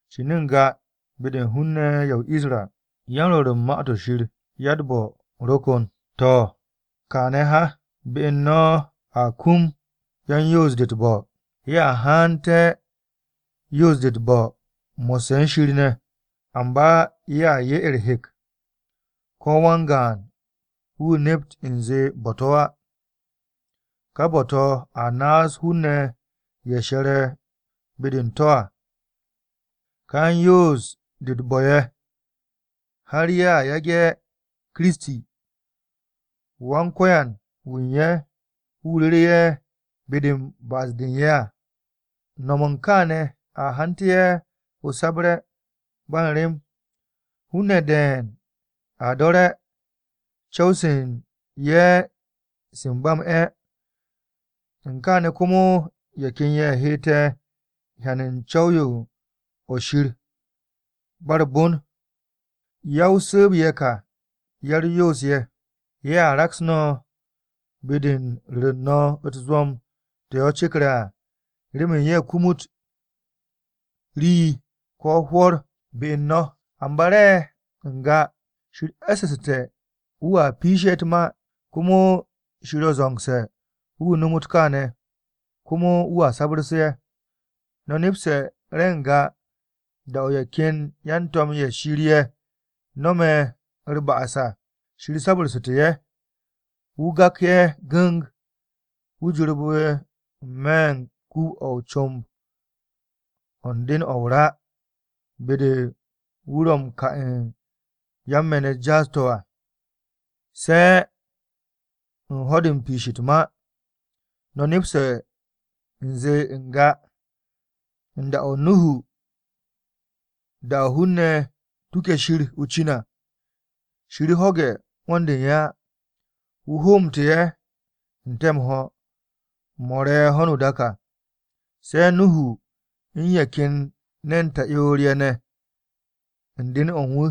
Cin n-ga be-de hun-ne̱ ye̱ o-Isra, yan-rwo̱r u̱n Ma-to̱ Shir ya-u̱t-bo̱ ro kon. To̱, kaane̱ ha, be u̱n no̱ a kum yan-yoos-de u̱t-bo̱. Ye̱a hante̱ yoos-de u̱t-bo̱ mo̱sse̱ u̱n Shir ne̱. Amba ye̱a 'ye u̱r-hek ko̱ wan-gaan wu̱ nept u̱nze bo̱-to̱ á. Ka bo̱-to̱ a naas hun-ne̱ ye̱ she̱re̱ be-de u̱n to̱ à. Ka yan-yoos-de u̱t-bo̱ ye̱ har ye̱a yage̱ Kiristi, Wan-Ko̱yan wu̱ u̱n ye̱ wu̱ ruru ye̱ be-de u̱n ba'as-de u̱n ye̱ à. Nom u̱n kaane̱ a hante̱ ye̱ o-sabre̱ ba u̱n rem. Hun-ne̱ de̱e̱n a do̱re̱ co̱w-se u̱n ye̱ se m-ba m-'e̱, u̱n kaane̱ komo ye̱ ken ye̱ hette̱ hyan u̱n co̱w-yo o-nip ba u̱r-bon. Ya-o-su̱u̱b ye̱ ka ya-u̱r-yoos-ye̱. Ye̱a raks no̱ be-de u̱n ru̱re̱ u̱n no̱ u̱t-zwo̱m to̱ ye̱ cekre̱ à, remen ye̱ kumut rii ko̱ hwo̱r be u̱n no̱. Amba re̱ n-ga, Shir e̱ssu̱su̱te̱ wu̱a piishe̱ ye̱ u̱t-ma. Komo Shir ro̱ zo̱ngse̱ wu̱ nomot kaane̱. Komo wu̱a sabu̱rse̱ ye̱. No̱ nepse̱ re̱ n-ga da-o̱ ye̱ ken yan-to̱m-ye̱ Shir ye̱ no̱me̱ u̱r-ba'as à, Shir sabu̱rsu̱te̱ ye̱. Wu̱ gak ye̱ gu̱ng, wu̱ jorbe̱ n-me̱ u̱n kuub-o̱ o-comb o̱ u̱n den-o̱ o-ra, be-de wu̱ ro̱ m-ka u̱n yan-me̱n-u̱t jaas-to̱ à, se̱ u̱n ho̱-de u̱n piish u̱t-ma. No̱ nepse̱ u̱nze n-ga, u̱n da-o Nuhu da-o̱ hun-ne̱ tuke̱ Shir o-cin à, Shir ho̱ge̱ 'wo̱n-de u̱n ye̱ á. Wu̱ hoomte̱ ye̱ n-te̱ m-ho̱, mo̱ re̱ ho̱no o-dak à, se̱ Nuhu u̱n ye̱ ken ne̱n ta'yoor-ye̱ ne̱ u̱n den-o̱ wu̱.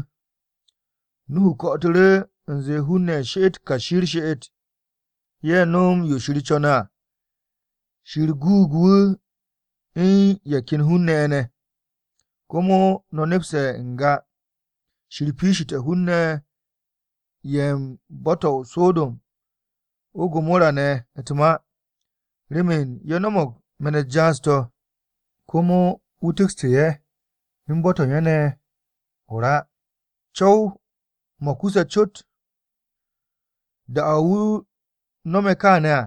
Nuhu ko̱'o̱tu̱ru̱ u̱nze hun-ne̱ she'et kashi u̱r-she'et, ye̱ no̱m yo Shir co̱ne̱ à. Shir guug wu̱ u̱n ye̱ ken hun-ne̱ ye̱ ne̱. Komo no̱ nepse̱ n-ga, Shir piishite̱ hun-ne̱ ye̱ u̱n bo̱-to̱ o-So̱do̱m, o-Gomora ne̱ u̱t-ma. Remen ye̱ no̱mo̱g me̱n-u̱t jaas-to̱, komo wu̱ tu̱kste̱ ye̱ u̱n bo̱-to̱ u̱n ye̱ ne̱ o-ra, co̱w-mo̱ kuse̱ cot. Da-o̱ wu̱ no̱me̱ kaane̱ à,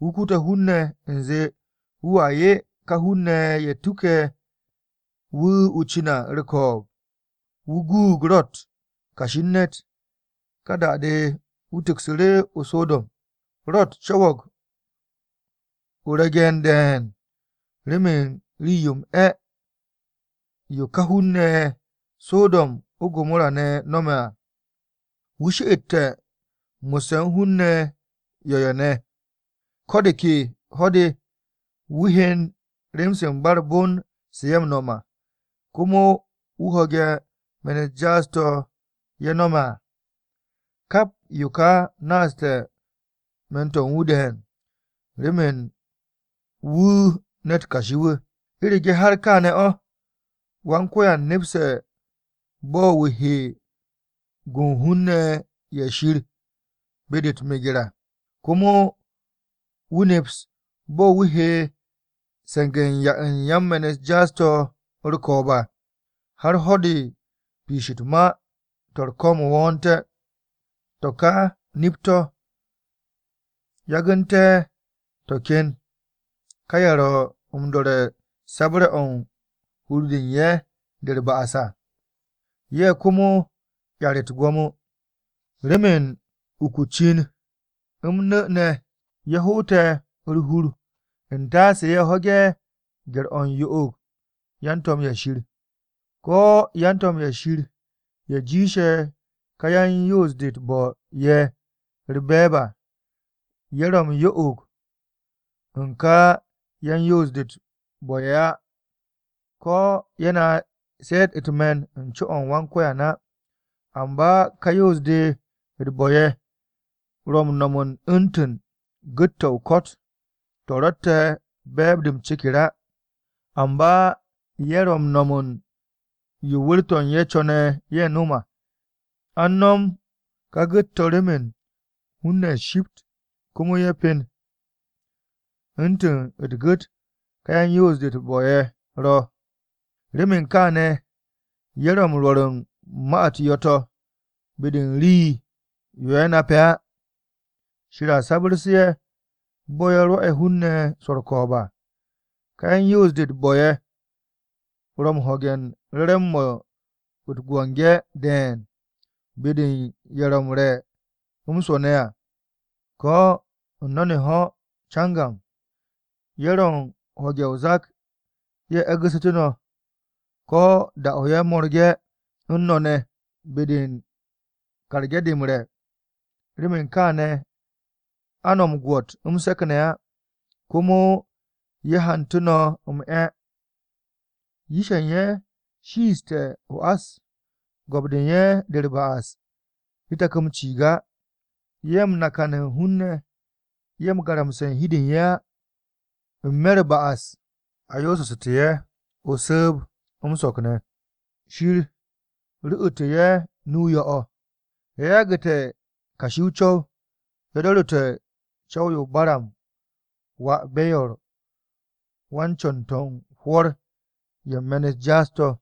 wu̱ kute̱ hun-ne̱ u̱nze wu̱a 'ye ka hun-ne̱ ye̱ tuke̱ wu̱ o-cin à u̱r-ko̱o̱b. Wu̱ guug Ro̱t, kashi u̱n ne̱t. Ka da-de wu̱ tu̱ksu̱ru̱ o-So̱do̱m. Ro̱t co̱wo̱g o-regen de̱e̱n remen rii-yo m-'e̱ yo ká hun-ne̱ ye̱ o-So̱do̱m, o-Gomora ne̱ no̱me̱ à. Wu̱ she'ette̱ mo̱sse̱ u̱n hun-ne̱ yo̱-ye̱ ne̱, ko̱ de ke ho̱-de wu̱ hyen rem-se u̱n ba u̱r-bon se ye̱ no̱me̱ à. Komo wu̱ ho̱ge̱ me̱n-u̱t jaas-to̱ ye̱ no̱me̱ à. Kap yo ka naaste̱ me̱n-to̱ u̱n wu̱ de̱e̱n, remen wu̱ ne̱t kashi-wu̱. U̱rege̱ har kááne̱ o̱, Wan-Ko̱yan nepste̱ bo̱ wu̱ he gu u̱n hun-ne̱ ye̱ Shir be-de u̱t-meger à. Komo wu̱ neps bo̱ wu̱ he se̱nge̱ u̱n 'ya u̱n yan-me̱n-u̱t jaas-to̱ u̱r-ko̱o̱b à, har ho̱-de u̱n piish u̱t-ma to̱ u̱r-ko̱m wo̱o̱nte̱. To̱ ka nip-to̱, yagu̱nte̱ ken ka ye̱ ro̱ m-do̱re̱ u̱n sabre̱-o̱ u̱n hur-de u̱n ye̱ de u̱r-ba'as à. Ye̱ komo 'yar u̱t-gwo̱mo. Remen uk o-cin m-nu̱ ne̱ ye̱ hoote̱ u̱r-hur u̱n taase ye̱ ho̱ge̱ gye̱r-o̱ u̱n yo'og u̱n yan-to̱m-ye̱ Shir. Ko̱ yan-to̱m-ye̱ Shir ye̱ jiishe̱ ka yan-yoos-de u̱t-bo̱ ye̱ u̱r-be̱e̱b à, ye̱ ro̱ m-yo'og u̱n ka yan-yoos-de u̱t-bo̱ ye̱ á. Ko̱ ye̱ naas ye̱ u̱t-me̱n u̱n n-co o̱ u̱n Wan-Ko̱yan á. Amba ka yan-yoos-de u̱t-bo̱ ye̱ ro̱ m-no̱m u̱ntu̱n gu̱t-to̱ o-ko̱t to̱ ro̱tte̱ be̱e̱b-de o-ceker á, amba ye̱ ro̱ m-no̱m yo wu̱r-to̱ u̱n ye̱ co̱ne̱ ye̱ nom à. An no̱m ka gu̱t-to̱ remen hun-ne̱ shipt komo ye̱ pen. U̱ntu̱ u̱t-gu̱t ka yan-yoos-de u̱t-bo̱ ye̱ ro̱, remen kaane̱ ye̱ ro̱ m-rwo̱r u̱n ma-u̱t yo̱-to̱ be-de u̱n rii-yo ye̱ nape̱ á. Shir a sabu̱rsu̱ ye̱ bo̱ ye̱ rwo̱'e̱ hun-ne̱ swo̱ u̱r-ko̱o̱b à. Ka yan-yoos-de u̱t-bo̱ ye̱ ro̱ m-ho̱ge̱ re̱re̱m-mo̱ u̱t-biki de̱e̱n be-de ye̱ ro̱ m-re̱ m-swo̱ ne̱ à, ko̱ u̱n no̱n-ho̱ cangam. Ye̱ ro̱ u̱n ho̱ge̱ o-zak ye̱ e̱gu̱ssu̱te̱ no̱ ko̱ da-o̱ ye̱ mo̱rge̱ u̱n no̱ ne̱ be-de u̱n karge̱ de m-re̱. Remen kaane̱ a no̱ m-gwo̱t m-se̱k ne̱ á komo ye̱ hantu̱ no̱ m-'e̱. Yish-ye̱ u̱n ye̱ shiishte̱ o-ás, go̱p-de u̱n ye̱ de u̱r-ba'as de tak m-ciig á. Ye̱ m-nakan u̱n hun-ne̱ ye̱ m-garamse̱ u̱n hi u̱n de u̱n ye̱ á n-me̱ u̱r-ba'as, a yoosu̱ssu̱te̱ ye̱ o-su̱u̱b m-so̱k ne̱. Shir ru̱'u̱tu̱ ye̱ nu-o yo̱-o̱. Ye̱ yagu̱te̱ kashi o-co̱w, ye̱ do̱ru̱te̱ co̱w-o Baram wà Beyor wan-co̱n-to̱ u̱n hwo̱r-ye̱ u̱n me̱n-u̱t jaas-to̱.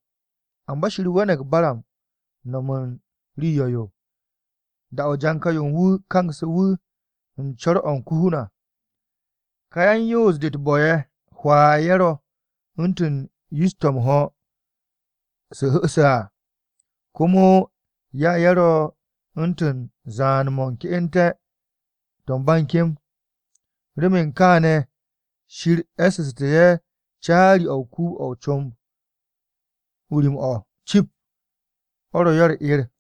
Amba Shir we̱ne̱g Baram no̱m u̱n rii yo̱-yo da-o̱ janka-yo u̱n wu̱ kangsu̱ wu̱ u̱n co̱r-o̱ u̱n ko-hun à. Ka yan-yoos-de u̱t-bo̱ ye̱ hwaa ye̱ ro̱ u̱ntu̱n yish-to̱ m-ho̱ to̱ hu̱se̱ à, komo ya ye̱ ro̱ u̱ntu̱n zaan-mo̱ ke'ente̱-to̱ ba u̱n kem. Remen kááne̱ Shir e̱ssu̱te̱ ye̱ caari-o̱ u̱n kuub-o̱ comb-o rim-o̱ cip, o̱ ro̱ ye̱ u̱r-'er.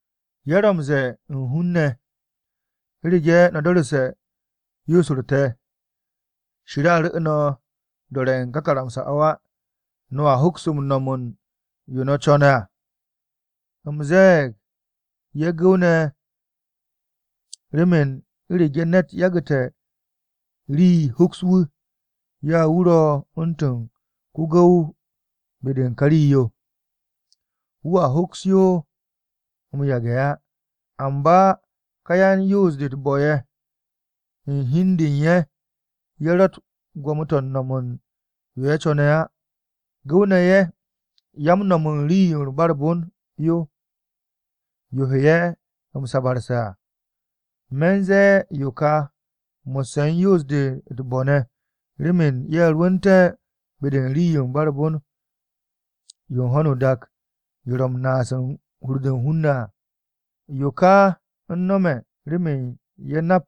Ye̱ ro̱ m-ze̱e̱ u̱n hun-ne̱, “U̱rege̱ no̱ do̱ru̱te̱ yoos-u̱r te̱, Shir a ru̱ no̱ do̱re̱ u̱n ka karamsa-o̱ á. No̱a hoks m-no̱m u̱n yo̱ no̱ co̱ne̱ à.” U̱m ze̱e̱g ye̱ gu̱w-ne̱ remen u̱rege̱ ne̱t yagu̱te̱ rii hoks wu̱, ya wu̱ ro̱ u̱ntu̱n ko-gu̱w be-de u̱n ka rii-yo. Wu̱a hoks yo m-yage̱ á. Amba ka yan-yoos-de u̱t-bo̱ ye̱ u̱n hi u̱n de u̱n ye̱, ye̱ ro̱tt gwo̱mo-to̱ u̱n no̱m u̱n yo̱ ye̱ co̱ne̱ á. Gu̱w-ne̱ ye̱ ya m-no̱m u̱n rii-yo ba u̱r-bon yo, yo he ye̱ m-sabarse̱ à. Me̱ u̱n ze̱e̱ yo ka mo̱sse̱ u̱n yan-yoos-de u̱t-bo̱ ne̱ remen ye̱ rwu̱nte̱ be-de u̱n rii-yo ba u̱r-bon yo u̱n ho̱no o-dak yo ro̱ m-naas u̱n hur-de u̱n hun-ne̱ à. Yo ka u̱n nome̱ remen ye̱ nak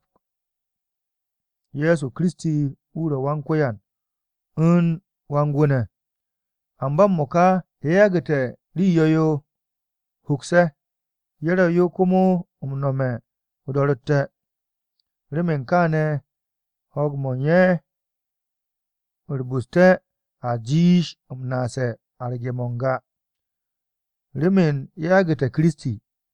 Ye̱so Kiristi wu̱ ro̱ Wan-Ko̱yan u̱n Wan-Gwu̱ ne̱. Amba m-mo̱ka ye̱ yagu̱te̱ rii yo̱-yo hoks ye̱, ye̱ ro̱ yo komo m-nome̱ o-do̱ro̱tte̱. Remen kaane̱ ho̱o̱g-mo̱ u̱n ye̱ u̱r-bu̱ste̱ a jiish m-naase̱ arge̱-mo̱ n-ga, remen ye̱ yagu̱te̱ Kiristi.